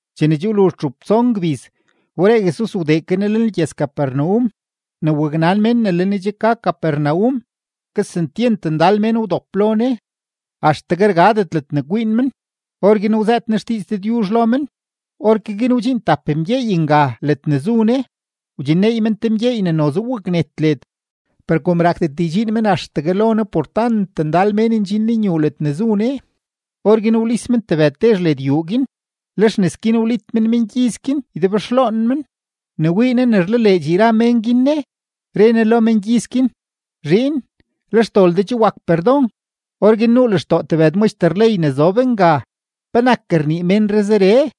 Chene che wluzh txup tson gbiz, wberee Jesus wdee ke Ne lenlgyëz-Capernaum. Ne waknan mén ne le Ne che ke ka Capernaum, kesentyent ndal mén wdop lo Ne, axtegue rgadet ledne kwiin men; orguin wzëët Ne xdiiz Dëdyuzh lo men. Orke guin wdxiin tap mén nga ledne zu Ne, wdxinneey men te mgyeey ne noze waknet led. Per kom rakdet ydxiin men axtegue lo Ne por tant ndal mén ndxin lenyuu ledne zu Ne, orguin wlis men tebëd tezh led yuu guin; lex nes guin wlit men mengyiz guin ydebxloon men. Ne wii Ne ne rlaleedx yra mén guin Ne, re Ne lo mengyiz guin: ―Zhiin, le xdol de che wak perdon. Orguin nuu lextoo tebëd maxter ley ne zob nga: “¿Penak rnii ménree zeree?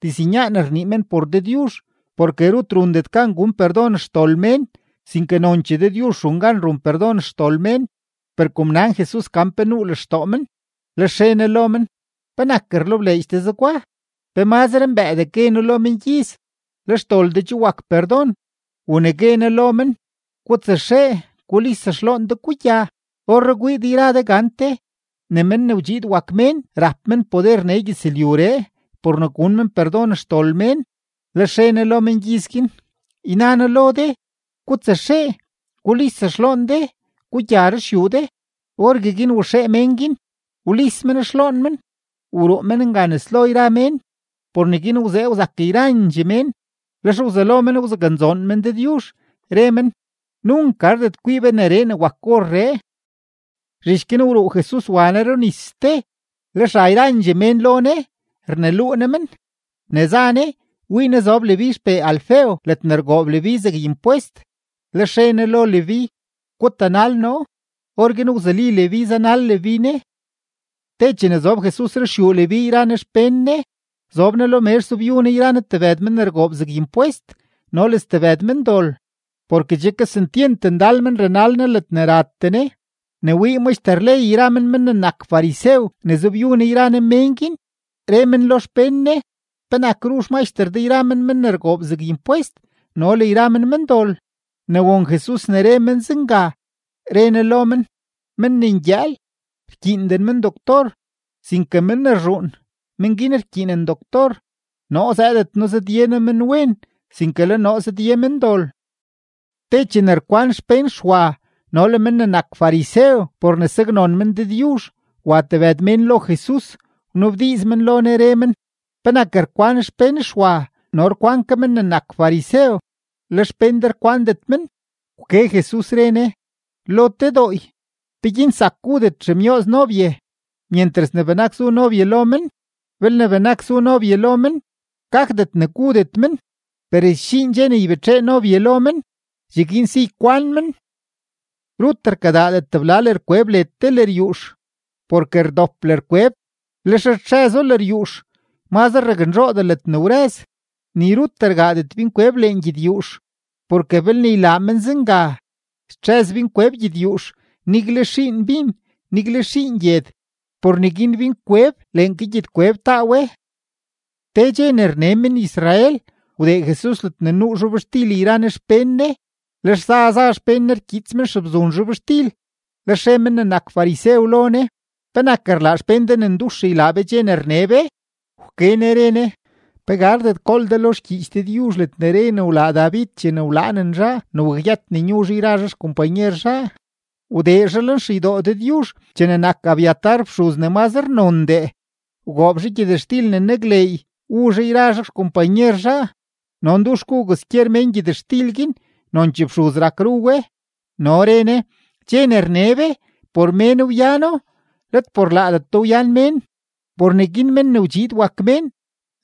Diznyaan rnii men por Dëdyuzh, porke rut rundet gan gun perdon xdol mén, sinke nonchee Dëdyuzh run gan run perdon xdol mén.” Per kom nan Jesus gan pe nuu lextoo men, lex re Ne lo men: ―¿Penak rlebleedx de zegwa? ¿Pe mazre mbëëdee gue noo lo mengyiz: “Le xdol de che wak perdon”, u ne gue noo lo men: “Gutsaxee gulis xloon de, gugya”? Orree kwii de yra de gante ne Men ne wdxiid wak Mén rap men poder nee gyëzlyuree por ne gun men perdon xdol mén. Lex re Ne lo mengyiz guin: ―Yna noo lo de, gutsaxee gulis xloon de, gugya ruxyuu de. Orgueguin waxee mén guin, wlis men xloon men, wruu men nga nes lo yra mén. Por neguin wzee wzak yrandxee mén, lex wzelo men wzaknzoon men Dëdyuzh, re men: ―Nunk gardet kwii be gak neree ne wak orree. Zhich guin wruu Jesus wa Ne runis ste. Lex ra yrandxee mén lo Ne, rneluu Ne men. Ne za Ne, wii Ne zob Leví xpee Alfeo ledne rgoob Leví zeg impwest, lex re Ne lo Leví: ―Gutanal noo. Orguin wzuli Leví zanal Leví Ne. Te chene zob Jesus ruxyuu Leví yra Ne xpén Ne, zob Ne lo mezh zobyu Ne yra Ne tebëd men ne rgoob zeg impwest no le stebëd mendol, porke che kesentyent ndal men ranal Ne ledne ratee Ne. Ne wii maxter ley yra men men ne nak farisew ne zobyu Ne yra Ne mén guin, re men lo xpén Ne: ―¿Penak ru xmaxter de yra men men ne rgoob zeg impwest no le yra men mendol? Ne won Jesus ne re men zenga, re Ne lo men: ―Men ne ngyëël, rkyiinden men doctor, sinke men ne rzhuun, men guin rkyiinen doctor. Noo zëëdet noo zëdye noo menwen, sinke le noo zëdye mendol. Te chene rkwan xpén Xwa no le men ne nak farisew por ne saknon men Dëdyuzh, wa tebëd mén lo Jesus, wnabdiiz men lo Ne, re men: ―¿Penak rkwan xpén Xwa no rkwan ke men ne nak farisew, le xpén de rkwandet men? Wke Jesus, re Ne: ―Lo te dooy, ¿peguin zak gudet xemyooz nobye myentras ne benak zu nobye lo men? Belne benak zu nobye lo men, gakdet ne gudet men. Per sdxiin dxe ne ybetxee nobye lo men; cheguin si ykwan men. ’Rut rkadaadet tebla lërkweb led te lëryuux, porke rdop lërkweb, lex rtxëzo lëryuux, mazre raknzhoodee ledne wrëz. Ni rut rgaadet binkweb lengyedyuux, porke belne ylaa men zenga, stxëz binkweb gyedyuux; nigle xiin bin, nigle xiin gyed. Por neguin binkweb leen ke gyedkweb taa we. Te dxe ne rne men-Israel, wdee Jesus ledne nuu zhobxtil yra Ne xpén Ne. Lex za za xpén Ne rkyiits men xebzun zhobxtil. Lex re men ne nak farisew lo Ne: ―¿Penak rlaa xpén de ne ndux ylaa be dxe ne rne be? Wke Ne re Ne: ―¿Pe gardet gool de lo xgyiich Dëdyuzh ledne re ne wlaa David chene wlaanen zhaa ne wakyët ne nyu zhaa yra zhaa xkompanyer zhaa? Wdee zhaa lenxeydoo Dëdyuzh chene nak Abiatar fxuz ne mazre nondee, wgoob zhaa gyëtxtil ne nakleey wu zhaa yra zhaa xkompanyer zhaa, no ndux gu kwaskyer mén gyëtxtil guin, nonchee fxuz rak ru we. No re Ne: ―Dxe ne rne be, por mén wyano, let por laadeto wyan mén. Por neguin Men ne wdxiid wak Mén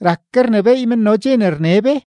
rak ke rnebééy men no dxe ne rne be.